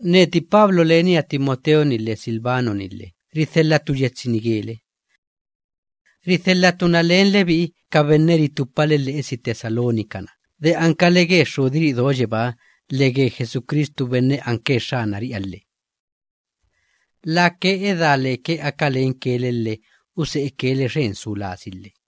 Neti Pablo, lenia Timoteo‑ni lhe Silvano‑ni lhe, ridhelhatu yetsi‑ni gele. Ridhelhatu na len lebi'i ka benne ritupale lhe'esi Tesalónica‑na de ankale ge Xxudiri'i do yebáha lhe ge Jesucristu benne anke Xxanari'iha lhe. Lake edá leke aka lenke le lhe use'eke le xen su lasi lhe.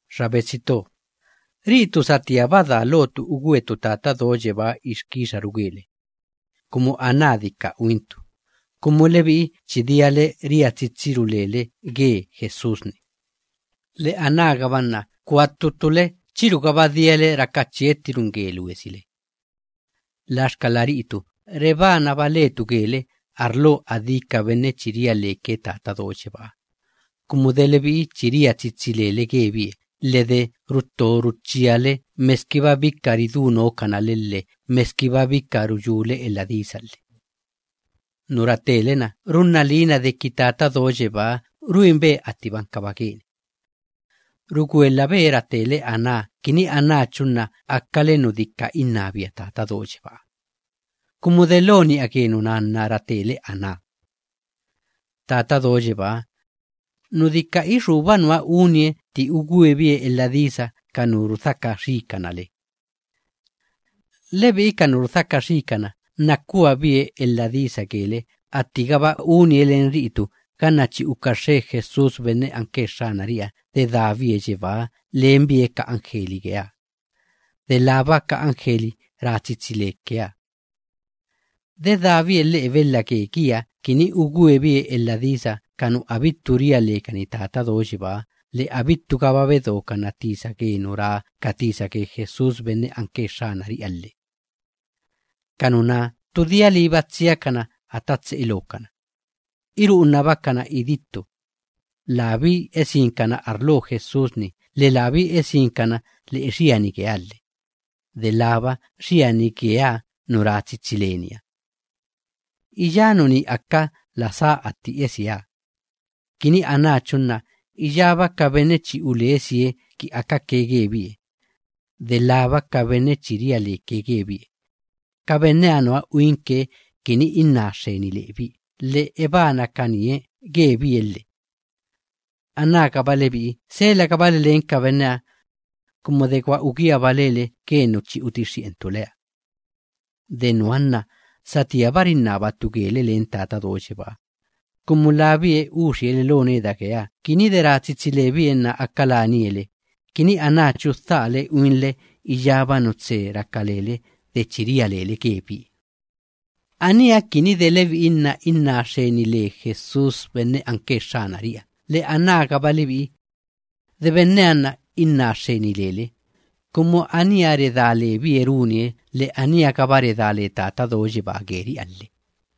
Xa betsi to, ri'itu satíaba daa lotu ugwetu Tata Do Yebáha ixkixaru gele, kumu aná dika uintu, kumu lebi'i chi diale ria tsitsiru lele ge Jesús‑ni, lhe anágaba nna kua ttu ttule chirugaba diale raka chiettiruin ge luesile. Laxkala ri'itu rebanaba letu gele arlo adí ka benne chi ria leke Tata Do Yebáha, kumu de lebi'i chi ria tsitsi lele gebie lhe de rutto ruchíale meskiba bika ridú nookana le lhe meskiba bika ruyúle elha disa lhe. Nu ratele‑na runna liina deki Tata Do Yebáha ruinbe attiba ankaba geni. Rugwelhabe ratele aná kini anáchu nna akale nu dika innabia Tata Do Yebáha, kumu delo ni'a ge nuná nna ratele aná. Tata Do Yebáha, nu dika ixúba nuha unie atti ugwebie elha disa ka nu rudhaka xiikana le. Lebi'i ka nu rudhaka xiikana nna kuabe elha disa gele, attigaba unie len ri'itu ganna chi uka xxe Jesús benne anke Xxanari'iha, dedábie yebáha lenbie ka anjeli geeha, delába ka anjeli ra tsitsi lekeha. Dedábie lhe'e belha ge giha, kini ugwebie elha disa ka nu abittu ria lekani Tata Do Yebáha, lhe abittugaba bedokana tisa ge nu ra ka tisa ge Jesús benne anke Xxanari'iha lhe. Ka nuná ttu dia liiba tsiakana ata tse'e lookana, iru'unabakana idittu, labí esinkana arlo Jesús‑ni lhe labí esinkana lhe'e xiani geeha lhe, delába xiani geeha nu ra tsitsi leniha. Iyá nuní aka la sá atti esieha, kini anáchu nna iyába ka benne chi ulesie ki akake gebie, delába ka benne chi ria leke gebie, ka benneha nuha uinke kini inná xxeni lebie lhe ebanakanie gebie lhe. Anágaba lebi'i selagabale len ka benneha, kumu de gwa ugíagaba lele ge nu chi utixxi'entu leha. De nuha nna satíaba rinnabatu gele len Tata Do Yebáha, kumu labie uxie le lo neda geeha, kini de ra tsitsi lebie nna aka lenie le, kini anáchu dhaale uinle iyába nu tse raka lele de chi ria lele gebie. Aníha kini de lebi'i nna inná xxeni le Jesús benne anke Xxanari'iha, lhe anágaba lebi'i, de benneha nna inná xxeni lele, kumu aníha redá lebie runie, lhe aníha‑gaba redá le Tata Do Yebaa geri'iha runie lhe.